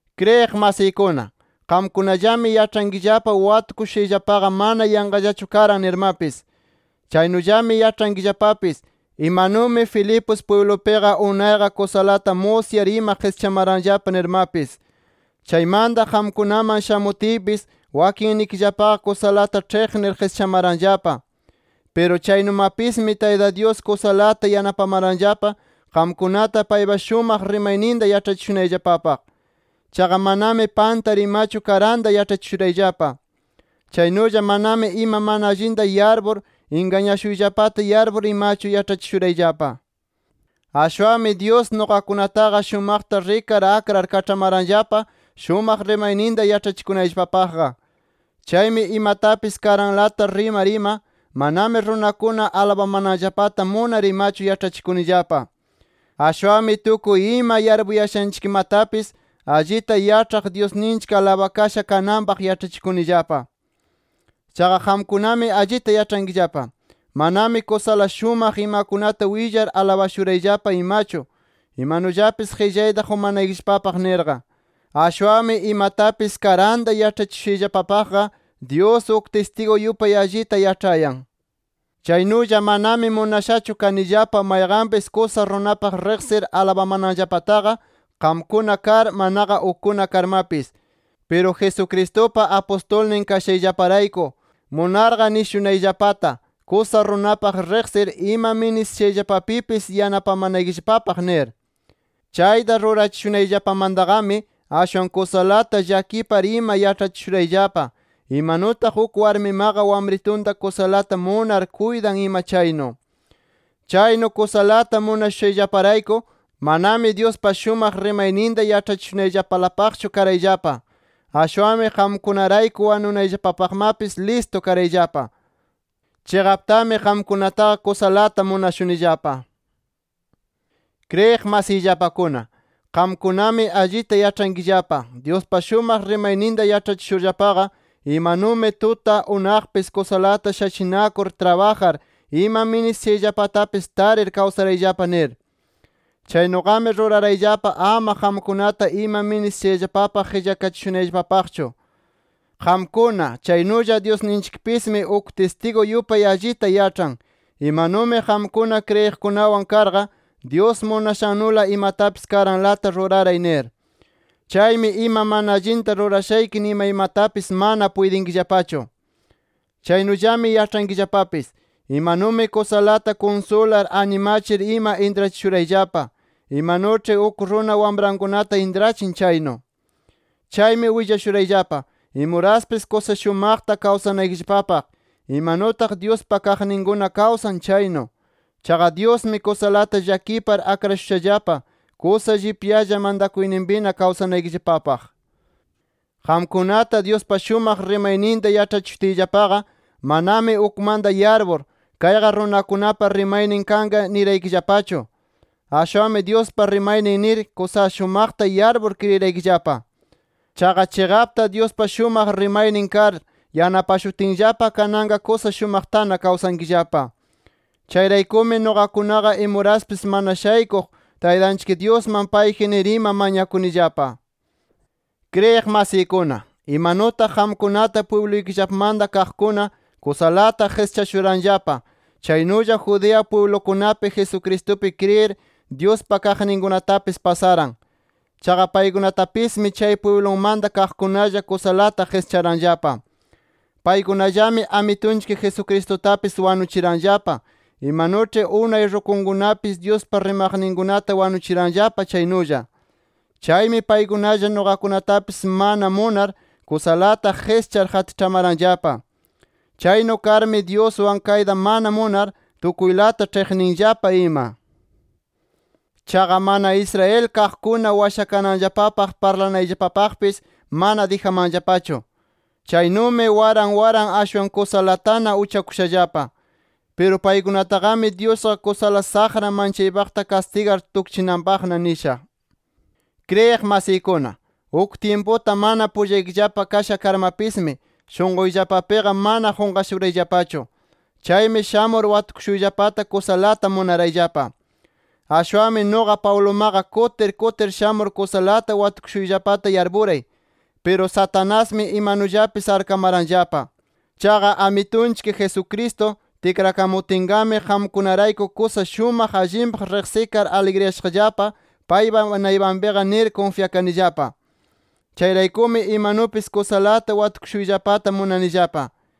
Kriyiq masiykuna, qamkunallami yaĉhankillapa watukushushayllapaqa mana yanqallachu karan nirmapis. Chaynullami yaĉhankillapapis, imanumi Filipos pwiblupiqa unayqa kusalata musyar ima qischamaranllapa nirmapis. Chaymanta qamkunaman shamutiypis, wakinnikillapaqa kusalata ĉhiqnir qischamaranllapa. Piru chaynumapismi Tayta Dyus kusalata yanapamaranllapa qamkunata paypa shumaq rimayninta yaĉhachishunayllapapaq. Chaqa manami pantar imachu karanta yaĉhachishurayllapa. Chaynulla manami ima mana allinta yarpur, ingañashuyllapata yarpur imachu yaĉhachishurayllapa. Ashwanmi Dyus nuqakunataqa shumaqta rikar akrar kaĉhamaranllapa, shumaq rimayninta yaĉhachikunayllapapaqqa. Chaymi imatapis karanlata rimar ima, manami runakuna alabamananllapata munar imachu yaĉhachikunillapa. Ashwanmi tukuy ima yarpuyashanchikmatapis allita yaĉhaq Dyusninchik alabakasha kananpaq yaĉhachikunillapa. Chaqa qamkunami allita yaĉhankillapa, manami kusala shumaq imakunata willar alabashurayllapa imachu, imanullapis qillayta qumanaykillapapaq nirqa. Ashwanmi imatapis karanta yaĉhachishushayllapapaqqa, Dyus uk tistigu yupay allita yaĉhayan. Chaynulla manami munashachu kanillapa mayqanpis kusa runapaq riqsir alabamananllapataqa qamkuna kar, manaqa ukkuna karmapis. Piru Jesucristupa apustulnin kashayllaparayku, munarqa nishunayllapata kusa runapaq riqsir ima ministishayllapapipis yanapamanaykillapapaq nir. Chayta rurachishunayllapamantaqami ashwan kusalata llakipar ima yaĉhachishurayllapa, imanutaq uk warmimaqa wamritunta kusalata munar kuytan ima chaynu. Chaynu kusalata munashushayllaparayku, manami Dyuspa shumaq rimayninta yaĉhachishunayllapalapaqchu karayllapa, ashwanmi qamkunarayku wanunayllapapaqmapis listu karayllapa. ¡Chiqaptami, qamkunataqa kusalata munashunillapa! Kriyiq masiyllapakuna, qamkunami allita yaĉhankillapa Dyuspa shumaq rimayninta yaĉhachishurllapaqa, imanumi tuta, unaqmapis kusalata shachinakur trabajar ima ministishayllapatapis tarir kawsarayllapa nir. Chaynuqami rurarayllapa ama qamkunata ima ministishayllapapaq qillakachishunayllapapaqchu. Qamkuna, chaynulla Dyusninchikpismi uk tistigu yupay allita yaĉhan, imanu qamkuna kriyiqkunawan karqa, Dyus munashannula imatapis karanlata ruraray nir. Chaymi ima mana allinta rurashayki nimaymatapis mana puytinkillapachu. Chaynullami yaĉhankillapapis, imanumi kusalata kunsular, animachir ima intrachishurayllapa, imanuĉhi uk runa wamrankunata intrachin chaynu. Chaymi willashurayllapa imuraspis kusa shumaqta kawsanaykillapapaq, imanutaq Dyuspa kaqninkuna kawsan chaynu. Chaqa Dyusmi kusalata llakipar akrashushallapa, kusa llipyalla mantakuyninpina kawsanaykillapapaq. Qamkunata Dyuspa shumaq rimayninta yaĉhachishutiyllapaqa, manami ukmanta yarpur, kayqa runakunapa rimaynin kanqa niraykillapachu. Ashwanmi Dyuspa rimaynin nir, kusa shumaqta yarpur kriyiraykillapa. Chaqa chiqapta Dyuspa shumaq rimaynin kar, yanapashutinllapa kananqa kusa shumaqtana kawsankillapa. Chayraykumi nuqakunaqa imuraspis mana shaykuq, Taytanchik Dyusman payji nir ima mañakunillapa. Kriyiq masiykuna, imanutaq qamkunata pwibluykillamanta kaqkuna kusalata qischashuranllapa, chaynulla Judea pwiblukunapi, Jesucristupi kriyir, Dyuspa kaqninkunatapis pasaran. Chaqa paykunatapismi chay pwiblunmanta kaqkunalla kusalata qischaranllapa. Paykunallami Amitunchik Jesucristutapis wanuchiranllapa, imanuĉhi unay rukunkunapis Dyuspa rimaqninkunata wanuchiranllapa chaynulla. Chaymi paykunalla nuqakunatapis mana munar kusalata qischar qatiĉhamaranllapa. Chaynu karmi, Dyuswan kayta mana munar, tukuylata ĉhiqninllapa ima. Chaqa mana Israel kaqkuna washakananllapaq parlanayllapapaqpis, mana dijamanllapachu. Chaynumi waran waran ashwan kusalatana uchakushallapa. Piru paykunataqami Dyusqa kusala saqra manchaypaqta kastigar tukchinanpaqna nisha. Kriyiq masiykuna, uk tyimputa mana pullaykillapa kasha karmapismi, shunquyllapapiqa mana qunqashurayllapachu. Chaymi shamur watukushuyllapata kusalata munarayllapa. Ashwanmi nuqa Pablumaqa kutir kutir shamur kusalata watukushuyllapata yarpuray. Piru Satanasmi imanullapis arkamaranllapa. Chaqa Amitunchik Jesucristo tikrakamutinqami, qamkunarayku kusa shumaq allinpaq riqsikar aligriyashaqllapa paypa naypanpiqa nir kunfyakanillapa. Chayraykumi imanupis kusalata watukushuyllapata munanillapa.